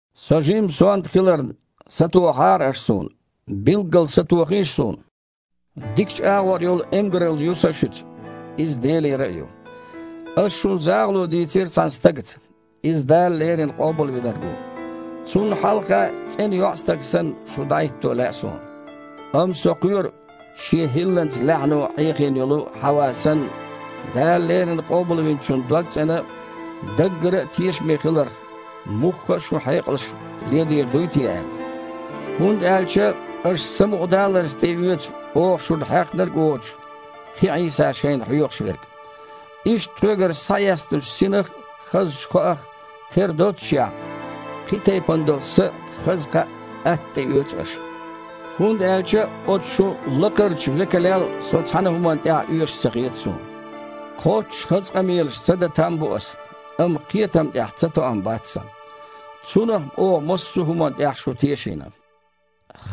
Со жимма сонта хиларна, сатохахьара аша суна. Билггал сатохийша суна! Дикачу агІор йолу эмгаралла ю сан шуьца, иза Делера а ю. Ас шуна захало дийцира цхьана стагаца, иза Дала леррина Къобалвинарг ву. Цунна хьалха, цІена йоІстаг санна, шу дІахІитто лаьа суна. Амма со кхоьру, шен хІилланца лаьхьано Іехийна йолу Хьава санна, Дала леррина Къобалвинчунна догцІена а, даггара а тешаме хиларх мухха а шун хьекъалш ледийр дуй те аьлла. ХІунда аьлча аша самукъадаларца тІеоьцу оха шуна хьехнарг а воцуш, кхин Іийса шайна хьоьхуш верг. Иштта, тхоьгара схьаэцначу Синах а, хазачу кхоах а тера доццушехь, кхин тайпана долу са а, хаза кхаъ а атта тІеоьцу аша! ХІунда аьлча оцу шун «лакхарчу векалел» со цхьана а хІуманна тІехь а оьшуш ца хета суна. Кхоччуш хаза къамелаш ца дан там бу аса, амма кхетам тІехь цатоам бац сан. Цунах-м оха массо а хІуманна тІехь шу тешийна.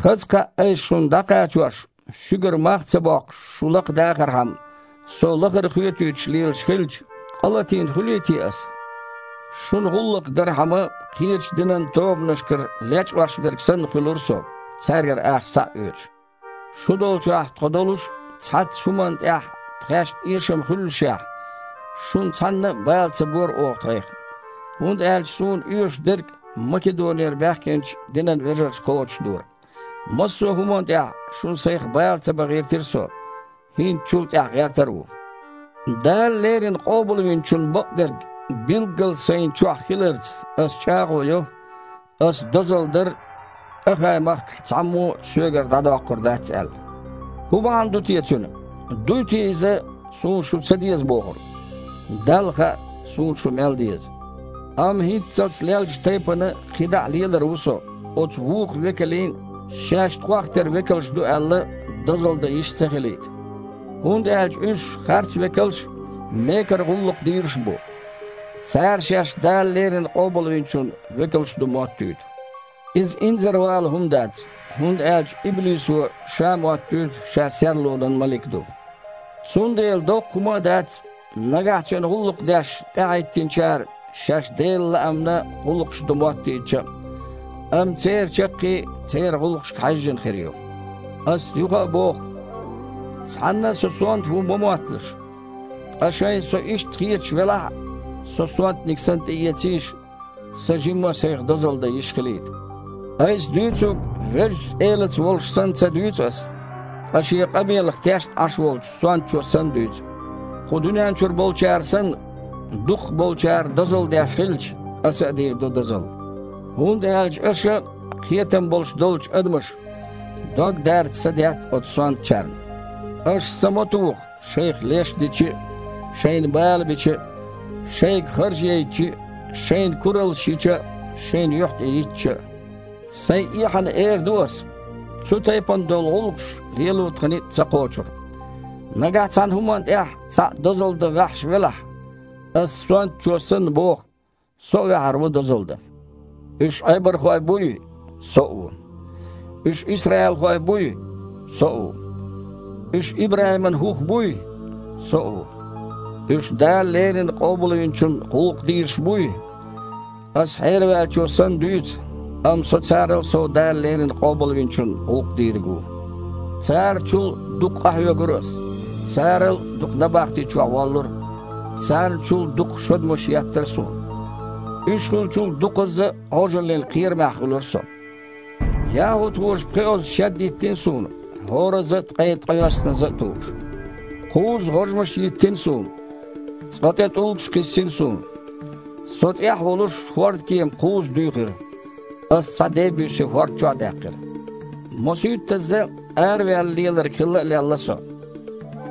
Хаза кхаъ айса шуна дІакхачош, шуьгара мах а ца боккхуш, шу лакхадахархьама, со лахара а хоьтуьйтуш лелаш хилча, къа латийна хуьлий те аса? Шуна гІуллакх дархьама, кхечу динан тобанашкара лечкъош верг санна хуьлура со, цаьргара ахча схьа а оьцуш. Шу долчохь тхо долуш, цхьацца хІуманна тІехь тхаьшна эшам хуьллушехь, шуна цхьанна а бала ца бора оха тхайх. ХІунда аьлча суна оьшуш дерг Македонера баьхкинчу динан вежарша кхочушдора. Массо а хІуманна тІехь шуна сайх бала ца бан гІиртира со, хІинца чул тІаьхьа гІертар а ву. Дала леррина Къобалвинчун бакъдерг билггал сайна чохь хиларца аса чІагІо йо, Аса дозалла дар Ахай-махкахь цхьаммо а соьгара дІадоккхур дац аьлла. ХІун бахьана ду те цуьнан? Дуй те иза, суна шу ца деза бохург? Далла хаьа, суна шу мел деза! Амма хІинццалц леллачу тайпана кхидІа а лелар ву со, оцу вукху «векалийн», шаьш тхох тера векалш ду аьлла, дозалла дан йиш ца хилийта. ХІунда аьлча уьш харцвекалш а, мекара гІуллакхдийраш а бу. Цара шаьш Дала леррина Къобалвинчун векалш ду моттуьйту. Иза инзарвала хІума дац, хІунда аьлча иблисо ша а моттуьйту ша серлонан малик ду. Цундела доккха хІума а дац, нагахь цуьнан гІуллакх деш тІаьхьахІиттинчара шаьш Делан лаамна гІуллакхаш до моттийтича а. Амма церан чаккхе церан гІуллакхашка хьаьжжина хир ю. Аса юха а боху: цхьанна а со сонта ву ма мотталаш. Ткъа шайна со иштта хеташ велахь а, со сонтаниг санна тІеэцийша, сан жимма а сайх дозалла дан йиш хилийта. Айса дуьйцург Везачу Элаца волуш санна ца дуьйцу аса, ткъа шен къамелах тешна Іаш волчу сонтачо санна дуьйцу. Кху дуьнен чуьра болчара санна, дукхахболчара дозалла деш хилча, аса а дийр ду дозалла. ХІунда аьлча аша, кхетам болуш долчу адамаша, дог дарца садетта оцу сонтачарна. Аша са ма туху, шайх леш дича а, шайна бала бича а, шайга харж яйтича а, шайна кураллаш йича а, шайн юьхь тІе йиттича а. Сайн эхьана эр ду аса, цу тайпана долу гІуллакхаш лело тхан ницкъ ца кхочура. Нагахь цхьана хІуманна тІехь цхьаъ дозалла дан ваьхьаш велахь – аса сонтачо санна боху – со а ваьхьар ву дозалла дан. Уьш Іебархой буй? Со а ву. Уьш исраилхой буй? Со а ву. Уьш ИбрахІиман хІух буй? Со а ву. Уьш Дала леррина Къобалвинчунна гІуллакх дийраш буй? Аса хьераваьллачо санна дуьйцу, амма со царал а сов Дала леррина Къобалвинчунна гІуллакх дийриг ву. Цара чул а дукха къахьоьгура аса. Царал а дукха набахти чохь воллура. Царна чул а дукха шодмаш еттара суна. Уьш хуьлучул а дукхазза а Іожаллин кхерамехь хуьлура со. ЯхІудхоша пхоьазза шед йиттина суна, хІоразза а ткъе ткъайоьсназза а тухуш. Кхузза гІожмаш йиттина суна. Цкъа тІе тІулгаш кхиссина суна. Со тІехь а волуш, хІордкема кхузза дуьйхира, аса цхьа дей-буьйсий хІорда чохь а даьккхира. Мосуьйттазза араваьлла леларг хилла а лелла со.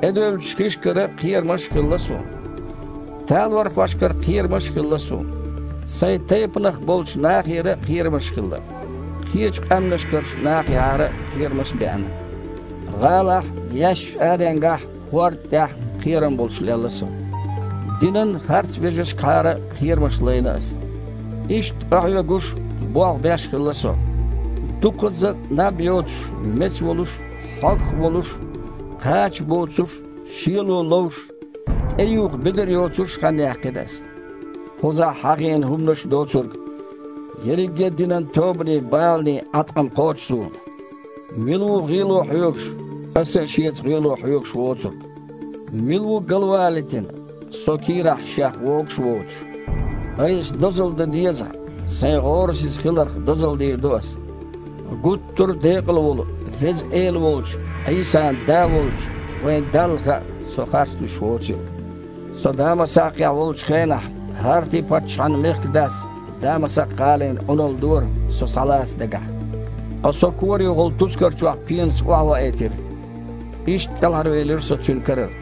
ТІедевллачу хишкахьара кхерамаш а хилла суна. Талорхошкахьара кхерамаш а хилла суна. Сайн тайпанах болчу нахехьара а кхерамаш хилла. Кхечу къаьмнашкарчу нахехьара кхерамаш беана. ГІалахь а, яьссачу аренгахь а, хІорда тІехь а кхерам болуш лелла со. Динан харцвежаршкахьара кхерамаш лайна аса. Иштта къахьоьгуш а, болх беш а хилла со. Дукхазза а наб йоцуш а, меца волуш а, хьогах волуш а, кхача боцуш а, шело ловш а, тІеюха бедар йоцуш а хан яьккхина аса. Кхузахь хьахийна хІуманаш доцург, ерриге а динан тобанийн баланийн Іаткъам кхочу суна. Мила ву гІело хьоьгуш, аса а шеца гІело хьоьгуш воцург? Мила ву галвалийтина, со кийрахь шех вогуш а воцуш? Айса дозалла дан дезахь, сайн гІорасиза хиларх дозалла дийр ду аса. Гуттара а декъала волу Веза Эла волчу Іийсан Да волчу вайн Далла хаьа, со харц луьйш воцийла. Со Дамасакхехь волчу хенахь, ХІарти-паччахьан мехкадас Дамасакх-гІалин Іуналла дора, со схьалаца дагахь. Ткъа со корехула тускар чохь пенаца охьаваийтира. Иштта кІелхьарвелира со цуьнан карара.